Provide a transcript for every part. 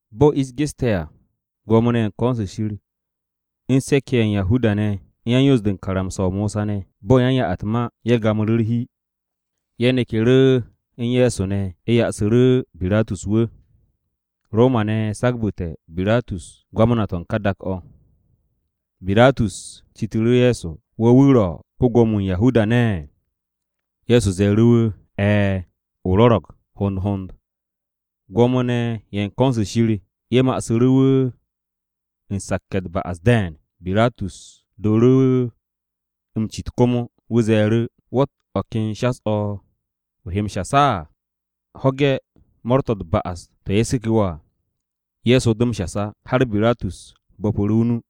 Bo̱ ish geste̱ à, Gwo̱mo-ne̱ ye̱ u̱n ko̱n-se Shir, u̱n se̱k-ye̱ ye̱ u̱n Yahuda-ne̱, u̱n yan-Yoos-de u̱n karamsa-o Mosa ne̱, bo̱ u̱n yan-ya-u̱t-ma, ye̱ gamu̱ru̱ u̱r-hi, ye̱ neku̱ru̱ u̱n Ye̱so ne̱, ye̱ ya'asu̱ru̱ Biratus wu̱. Roma-ne̱ sagbu̱te̱ Biratus Ko-Gwamna-wu̱ u̱n ka dak-o̱. Biratus citu̱ru̱ Ye̱so, “¿Wo̱ wu̱ ro̱ ko-Gwo̱mo-wu̱ u̱n Yahuda-ne̱?” Ye̱so ze̱e̱ru̱ wu̱, “E̱e̱, o rwo̱ro̱g hond hond.” Gwo̱mo-ne̱ ye̱ u̱n ko̱n-se Shir ye̱ ma'asu̱ru̱ wu̱ u̱n sakke̱ u̱t-ba'as de̱e̱n. Biratus dooru̱ wu̱ m-cit komo. Wu̱ ze̱e̱ru̱, “¿Wo̱tt o̱ ken shas-o̱ o he m-shas á? ¿Ho̱ge̱ mo̱o̱r-to̱ u̱t-ba'as to̱ ye̱ seku̱ wo̱ à?” Ye̱so do m-shas á, har Biratus bo̱pu̱ru̱ o-nu.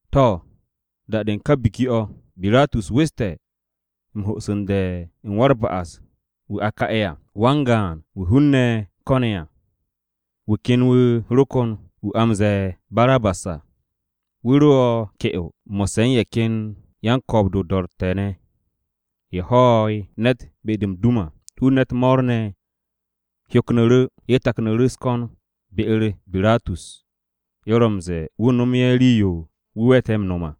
To̱, da-de u̱n ka biki-o̱, Biratus weste̱ m-ho'su̱nde̱ u̱n wa-u̱r-ba'as-wu̱ a ka'e̱ à, wan-gaan wu̱ hun-ne̱ ko̱ne̱ à. Wu̱ ken wu̱ ro kon wu̱ a m-ze̱e̱ Barabas à. Wu̱ ro ke'o à, mo̱sse̱ u̱n ye̱ ken yan-ko̱o̱b-de o-do̱ro̱tte̱ ye̱ ne̱ à, ye̱ ho̱'e̱ ne̱t be-de m-dum à. Hun-ne̱ u̱t-mo̱o̱r ne̱ hyoknu̱ru̱, ye̱ taknu̱ru̱ u̱s-ko̱n be-u̱r Biratus, ye̱ ro m-ze̱e̱ wu̱ nomu̱ ye̱ rii-yo wu̱ we̱te̱ m-no̱m à.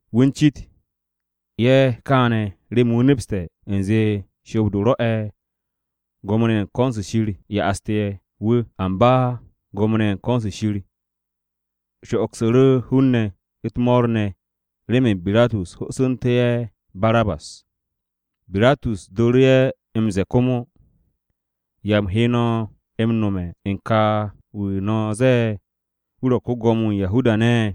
Wu̱ u̱n cit ye̱ kaane̱ remen wu̱ nepste̱ u̱nze shoob-de rwo̱'e̱ Gwo̱mo-ne̱ ye̱ u̱n ko̱n-se Shir ye̱ ya'aste̱ wu̱. Amba Gwo̱mo-ne̱ ye̱ u̱n ko̱n-se Shir sho'ogsu̱ru̱ hun-ne̱ u̱t-mo̱o̱r ne̱ remen Biratus ho'osu̱ntú̱ ye̱ Barabas. Biratus dooru̱ ye̱ m-ze̱e̱ komo, “¿Ya u̱m he m-no̱mu̱ ne̱ u̱n ka wu̱ no̱ ze̱e̱ wu̱ ro̱ ko-Gwo̱mo-wu̱ u̱n Yahuda-ne̱?”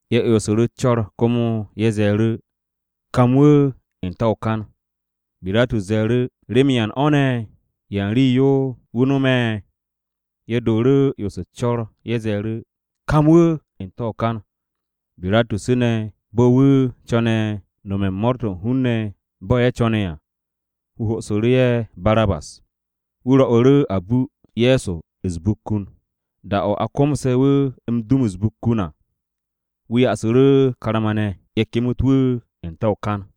Ye̱ 'yonsu̱ru̱ u̱s-co̱r komo, ye̱ ze̱e̱ru̱, “Kam wu̱ n-te̱ o-kan.” Biratus ze̱e̱ru̱, “¿Remen yan o̱ ne̱? ¿Yan rii-yo ne̱ wu̱ no̱me̱?” Ye̱ dooru̱ 'yonsu̱ u̱s-co̱r, ye̱ ze̱e̱ru̱, “Kam wu̱ de̱ n-te̱ o-kan.” Biratus ne̱, bo̱ wu̱ co̱ne̱ nome̱ u̱n mo̱o̱r-to̱ u̱n hun-ne̱ bo̱ ye̱ co̱ne̱ à, wu̱ ho'osu̱ru̱ ye̱ Barabas. Wu̱ rwo̱'u̱ru̱ a bu Ye̱so u̱s-bukkun. Da-o̱ a komse̱ wu̱ m-dum u̱s-bukkun à, wu̱ ya'asu̱ru̱ karma-ne̱, ye̱ kemet wu̱ n-te̱ o-kan.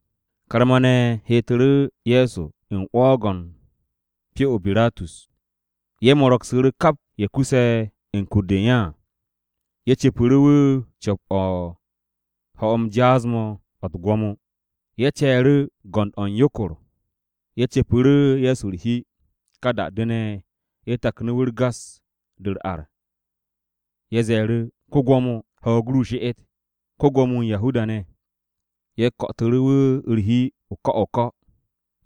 Karma-ne̱ heetu̱ru̱ Ye̱so u̱n 'wo̱o̱g-o̱ u̱n pyo-o Biratus. Ye̱ mo̱ro̱gsu̱ru̱ kap ye̱ kuse̱ u̱n kur-de u̱n ye̱ à. Ye̱ cu̱pu̱ru̱ wu̱ co̱p-o̱ u̱n ho̱-m jaas-mo̱ o̱ u̱t-gwo̱mo. Ye̱ ce̱e̱ru̱ o-go̱nd o̱ u̱n yokor, ye̱ cu̱pu̱ru̱ Ye̱so u̱r-hi. Ka da-de ne̱, ye̱ taknu̱ wu̱ u̱r-gas de u̱r-ar. Ye̱ ze̱e̱ru̱, “Ko-Gwo̱mo, ho̱o̱g ru she'et, ko-Gwo̱mo-wu̱ u̱n Yahuda-ne̱.” Ye̱ ko̱'o̱tu̱ru̱ wu̱ u̱r-hi o-ko̱ o-ko̱,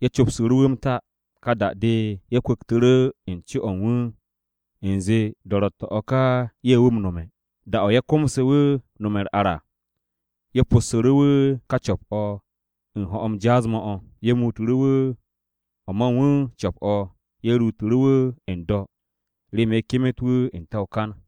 ye̱ copsu̱ru̱ wu̱ m-ta. Ka da-de, ye̱ kwu̱ktu̱ru̱ n-co o̱ u̱n wu̱ u̱nze do̱ro̱tte̱-o̱ ka ye̱ wu̱ m-nome̱. Da-o̱ ye̱ komse̱ wu̱ m-nome̱ u̱r-ar à, ye̱ possu̱ru̱ wu̱ ka co̱p-o̱ u̱n ho̱-m jaas-mo̱ o̱, ye̱ muutu̱ru̱ wu̱ o̱ ma u̱n wu̱ co̱p-o̱, ye̱ ruutu̱ru̱ wu̱ n-do̱ remen ye̱ kemet wu̱ n-te̱ o-kan.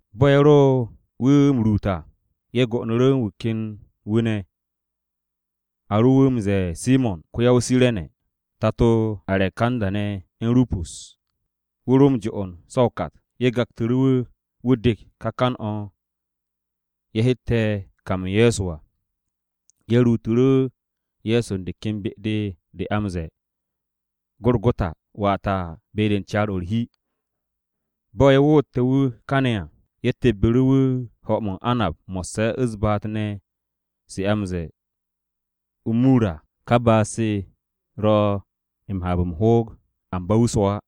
Bo̱ ye̱ ro wu̱ m-ruut à, ye̱ go'onu̱ru̱ u̱n wu̱ ken wu̱ ne̱. A ro wu̱ m-ze̱e̱ Simo̱n wa-o-Kire̱ni, tato Arekanda ne̱ u̱n Rupus. Wu̱ ro m-jo'on so̱ o-kat. Ye̱ gaktu̱ru̱ wu̱, wu̱ dek ka kan-o̱ ye̱ hette̱ kam u̱n Ye̱so à. Ye̱ ruutu̱ru̱ Ye̱so de ken be-de, a de m-ze̱e̱ o-Gorogota, (wata, be-de u̱n caar-o̱ u̱r-hi). Bo̱ ye̱ woote̱ wu̱ kane̱ à, ye̱ tebbu̱ru̱ wu̱ m-mo̱di mo̱sse̱ u̱s-baat ne̱ se a m-ze̱e̱ o-mur à. Ka baat-se ro̱ m-haab m-hoog, amba wu̱ swo̱ á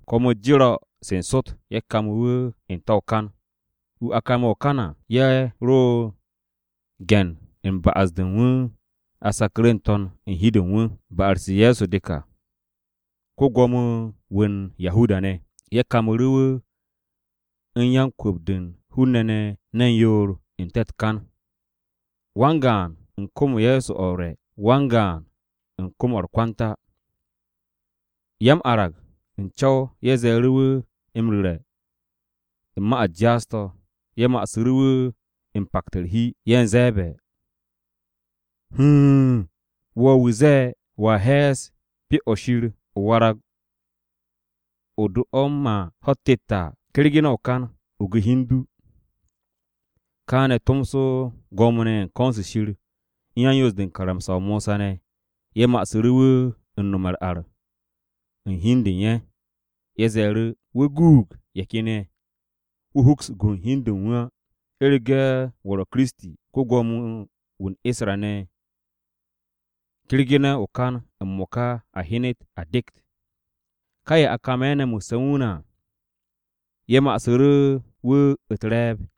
Kwo̱m-u̱s jero̱ se̱ n-sot, ye̱ kame̱ wu̱ n-te̱ o-kan. Wu̱ a kame̱ o-kan à, ye̱ ro u̱n ge̱n u̱n ba'as-de u̱n wu̱ a saku̱ru̱ n-to̱n u̱n hi-de u̱n wu̱. Ba'as-u̱r Ye̱so de ka, “Ko-Gwo̱mo-wu̱ u̱n Yahuda-ne̱.” Ye̱ kamu̱ru̱ wu̱ u̱n yan-kwu̱p-de u̱n hun-ne̱ ne̱ ne̱n yoor n-te̱ u̱t-kan, wan-gaan u̱n kom-o Ye̱so o̱ u̱r-re̱, wan-gaan u̱n kom-o̱ u̱r-kwanta. Ya-m-arag u̱n co̱w ye̱ ze̱e̱ru̱ wu̱ m-ru̱re̱ u̱n ma-u̱t jaas-to̱. Ye̱ ma'asu̱ru̱ wu̱ m-pakte̱ u̱r-hi, ye̱ u̱n ze̱e̱be̱, “Huun! Wo̱ wu̱ ze̱e̱ wo̱a he̱e̱s Pyo-o̱ Shir, o warag o̱ do m-ma ho̱-u̱t tet à, kergene̱ o-kan, o gu hi u̱n du!” Kaane̱ tomso Gwo̱mo-ne̱ ye̱ u̱n ko̱n-se Shir u̱n yan-Yoos-de u̱n karamsa-o Mosa ne̱ ye̱ ma'asu̱ru̱ wu̱ u̱n nome̱ u̱r-ar u̱n hi u̱n de u̱n ye̱. Ye̱ ze̱e̱ru̱, “Wu̱ guug ye̱ ken ye̱, wu̱ hoks gun hi u̱n de u̱n wu̱ á. U̱rege̱ wu̱ ro̱ Kiristi, ko-Gwo̱mo-wu̱ u̱n Isra-ne̱ wu̱, kergene̱ o-kan m-mo̱ka a hyenet a dekt!” Ka ye̱ a kame̱ ne̱ mo̱sse̱ u̱n wu̱ ne̱ à, ye̱ ma'asu̱ru̱ wu̱ u̱t-re̱e̱b.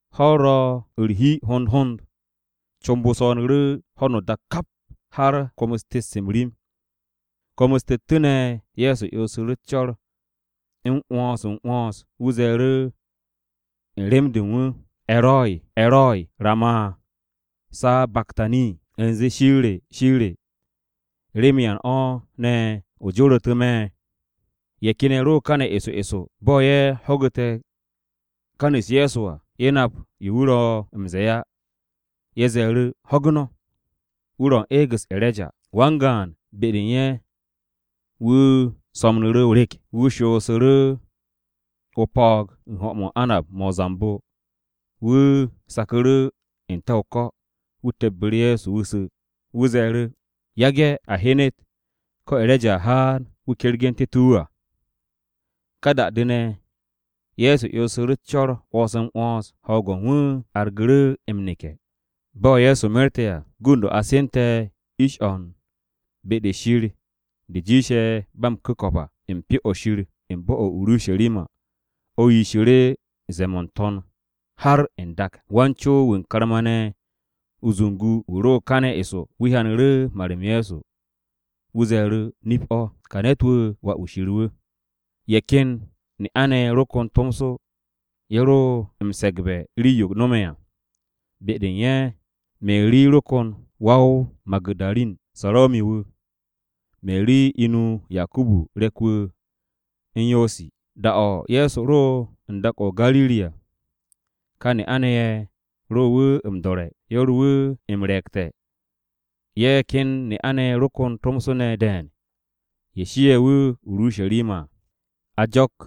Ho̱-u̱r ro̱ u̱r-hi hond hond, comb-o swo̱o̱nu̱ru̱ ho̱no o-dak kap har kwo̱m-u̱s tet-se m-rim. Kwo̱m-u̱s tettu̱ ne̱ Ye̱so 'yonsu̱ru̱ u̱s-co̱r 'wo̱ns-m-'wo̱ns, wu̱ ze̱e̱ru̱ u̱n rem-de u̱n wu̱, “E̱roi, E̱roi, ¿rama sabaktani?” U̱nze, “Shir re, Shir re, ¿remen yan o̱ ne̱ o joru̱tu̱ me̱?” Ye̱ ken ye̱ ro kane̱ eso eso. Bo̱ ye̱ ho̱gu̱te̱ kan-u̱s Ye̱so à, ye̱ nap yo wu̱ ro̱ m-ze̱e̱ á, ye̱ ze̱e̱ru̱, “Ho̱gu̱ no̱, wu̱ ro̱ u̱n eeg-u̱s E̱reja.” Wan-gaan be-de u̱n ye̱ wu̱ so̱mnu̱ru̱ o-rek, wu̱ shoosu̱ru̱ o-po̱o̱g u̱n ho̱-mo̱ o-anab-mo̱ o-zambo. Wu̱ saku̱ru̱ n-te̱ o-ko̱, wu̱ tebbu̱ru̱ Ye̱so wu̱ su̱. Wu̱ ze̱e̱ru̱, “Yage̱ a hyenet ko̱ E̱reja a haan wu̱ kergu̱ntu̱te̱ wu̱ à.” Ka da-de ne̱, Ye̱so 'yonsu̱ru̱ u̱s-co̱r 'wo̱ns-m-'wo̱ns. Ho̱o̱g-o̱ u̱n wu̱ argu̱ru̱ m-neke̱. Bo̱ Ye̱so merte̱ à, gund-o̱ a sente̱ ish-o̱ u̱n “Be-de u̱n Shir de jiishe̱ ba m-ku̱ko̱p à” u̱n Pyo-o̱ Shir u̱n bo̱-o̱ o-Urusharima, o̱ yishu̱ru̱ ze̱e̱-mo̱ n-to̱n har n-dak. Wan-co-wu̱ u̱n karma-ne̱ o-zungu wu̱ ro káne̱ eso, wu̱ hyanu̱ru̱ mar-m Ye̱so. Wu̱ ze̱e̱ru̱, “Nip-o̱, ka ne̱t-wu̱ Wà-wu̱ Shir wu̱.” Ye̱ ken ne'a-ne̱ ye̱ ro kon tomso, ye̱ ro m-se̱gbe̱ rii-yo no̱me̱ à. Be-de u̱n ye̱ Meri ro kon wa-o-Magu̱darin, Sarome̱ wu̱, Meri inu Yakubu re̱k-wu̱ u̱n Yosi. Da-o̱ Ye̱so ro u̱n dak-o̱ o-Gariri à, Kà ne'a-ne̱ ye̱, ye̱ ro wu̱ m-do̱re̱. Ye̱ ro wu̱ m-re̱e̱gte̱. Ye̱ ken ne'a-ne̱ ye̱ ro kon tomso ne̱ de̱e̱n ye̱ shie̱ wu̱ o-Urusharima à.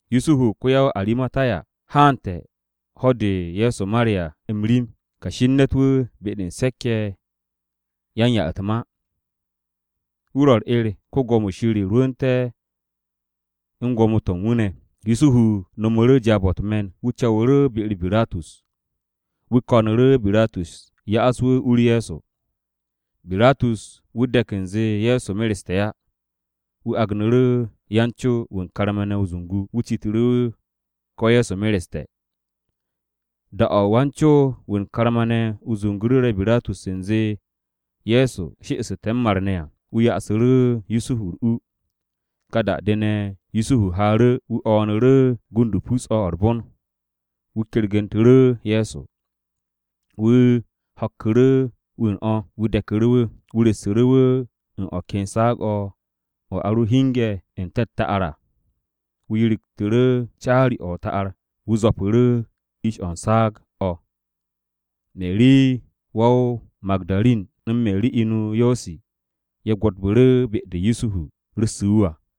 Yusuhu ko-ya-o-Aramatiya haante̱ ho̱-de Ye̱so mare̱ à m-rim. Kashi u̱n ne̱t-wu̱ be-de u̱n se̱k-ye̱ yan-ya-u̱t-ma. Wu̱ ro̱ u̱r-'er Shir rwu̱u̱nte̱ u̱n gwo̱mo-to̱ u̱n wu̱ ne̱. Yusuhu no̱mu̱ru̱ jaab-o̱ u̱t-me̱n, wu̱ co̱wu̱ru̱ be-u̱r Biratus. Wu̱ ko̱nu̱ru̱ Biratus ya'as wu̱ u-u̱r Ye̱so. Biratus wu̱ de̱k u̱nze Ye̱so mereste̱ á. Wu̱ agnu̱ru̱ wan-co-wu̱ u̱n karma-ne̱ o-zungu, wu̱ citu̱ru̱ wu̱ ko̱ Ye̱so mereste̱ à. Da-o̱ wan-co-wu̱ u̱n karma-ne̱ o-zungu ru̱re̱ Biratus u̱nze Ye̱so she'esu̱te̱ m-mar ne̱ à, wu̱ ya'asu̱ru̱ Yusuhu u̱r-u. Ka da-de ne̱, Yusuhu haaru̱, wu̱ o̱o̱nu̱ru̱ gund-o pus-o̱ o̱ u̱r-bon. Wu̱ kergu̱ntu̱ru̱ Ye̱so. Wu̱ ho̱kku̱ru̱ wu̱ u̱n o̱. Wu̱ de̱ku̱ru̱ wu̱, wu̱ ru̱ssu̱ru̱ wu̱ u̱n o̱ ken saag-o̱ o̱ a ro hinge̱ n-te̱ o-ta'ar à. Wu̱ yirigtu̱ru̱ caari-o̱ o-ta'ar, wu̱ zwo̱pu̱ru̱ ish-o̱ u̱n saag u̱n o̱. Meri wa-o-Magu̱darin u̱n Meri inu Yosi ye̱ gwo̱tu̱ru̱ be-de Yusuhu ru̱ssu̱ wu̱ à.